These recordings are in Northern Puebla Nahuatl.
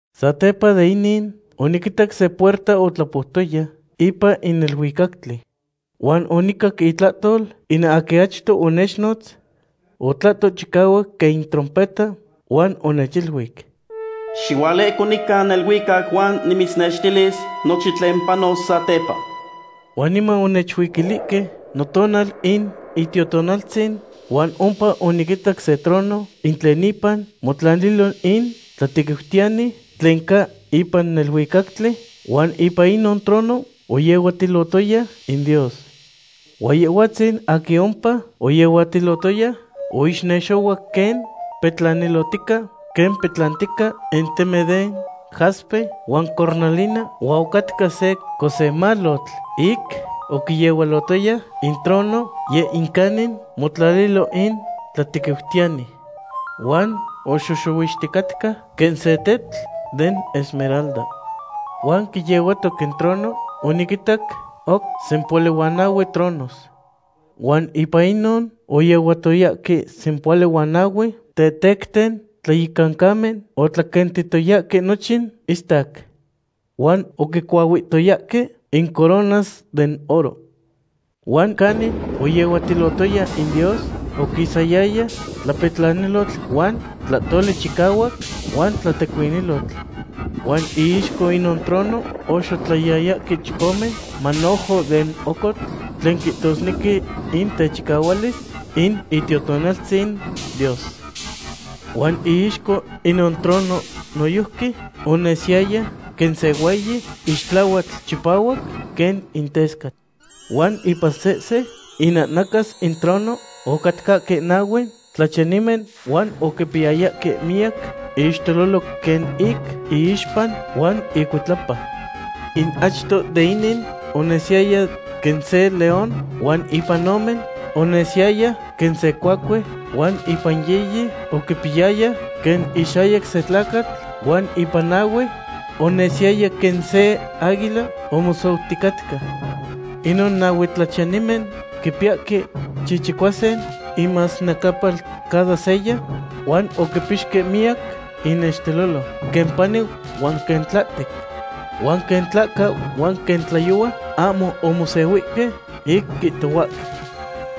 Satepa de inin, oniquitac se puerta otlapoutoya ipan in neluicactli. Huan onicac itlahtol in aquin achto onechnotz. Otlahto chicahuac quen in trompeta huan onechiluic: ―Xihualehco nica neluicac huan nimitznextilis nochin tlen panos satepa. Huan niman onechuiquilihque notonal in Itiotonaltzin huan ompa oniquitac se trono in tlen ipan motlalilo in tlatequiutiyani tlen ca ipan neluicactli, huan ipan inon trono oyehuatilotoya in Dios. Huan Yehhuatzin aquin ompa oyehuatilotoya oixnexohuac quen petlanilotica quen petlantica in temen de jaspe huan cornalina, huan ocatca se cosemalotl ic oquiyehualotoya in trono, yeh in canin motlalilo in tlatequiutiyani. Huan oxoxohuixticatca quen se tetl den esmeralda. Huan quiyehuatoc in trono oniquinitac oc sempohuali huan nahue tronos. Huan ipan inon oyehuatoyahque sempohuali huan nahue tetecten tlayecancamen otlaquentitoyahque nochin istac. Huan oquicuahuihtoyahque in coronas den oro. Huan canin oyehuatilotoya in Dios, oquisayaya tlapetlanilotl huan tlahtoli chicahuac huan tlatecuinilotl. Huan iixco inon trono oxotlayayahque chicome manojo den ocotl tlen quihtosnequi in techicahualis in Itiotonaltzin Dios. Huan iixco inon trono noyojqui onesiyaya quen se hueyi ixtlahuatl chipahuac quen in tescatl. Huan ipan sehse inahnacas in trono ocatcahque nahue tlachiyanimen huan oquipiyayahque miyac ixtelolo quen ic iixpa huan icuitlapa. In achto de inin onesiyaya quen se león, huan ipan ome, onesiyaya quen se cuacue, huan ipan yiyi, oquipiyayaya quen ixayac se tlacatl, huan ipan nahue, onesiyaya quen se aguila omosouticatca. Inon nahue tlachiyanimen quipiyahque chichicuasin inmasnecapal cada seya, huan oquipixque miyac inixtelolo, quen pani huan quen tlahtec. Huan quen tlahca huan quen tlayohua ahmo omosehuihque ic quihtohuahque: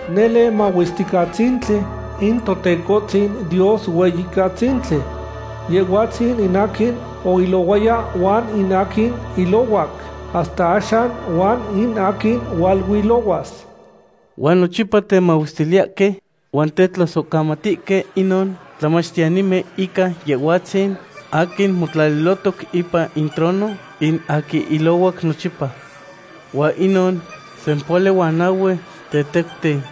¡Nele mahuesticatzintli in Totecohtzin Dios Hueyicatzintli! Yehhuatzin in aquin oilohuaya huan in aquin ilohuac hasta axan huan in aquin hualuilohuas. Huan nochipa temahuestiliyahque huan tetlasohcamatihque inon tlachiyanimen ica Yehhuatzin aquin motlalilohtoc ipan in trono, in aquin ilohuac nochipa. Huan inon sempohuali huan nahue tetecten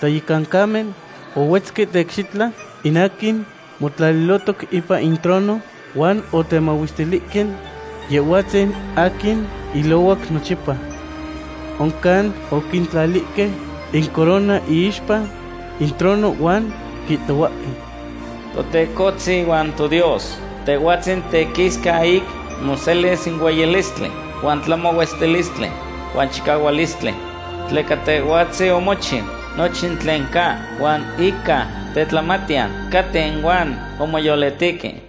tlayecancamen ohuetzque teicxitla in aquin motlalilohtoc ipan in trono, huan otemahuestilihque Yehhuatzin aquin ilohuac nochipa. Oncan oquintlalihque incorona iixpa in trono huan quihtohuahque: Totecohtzin huan toDios, Tehhuatzin tequisca ic moselis in hueyilistli huan tlamahuestilistli huan chicahualistli. Tleca Tehhuatzin omochiu nochin tlen ca, huan ica tetlamatiyan caten huan omoyolitihque.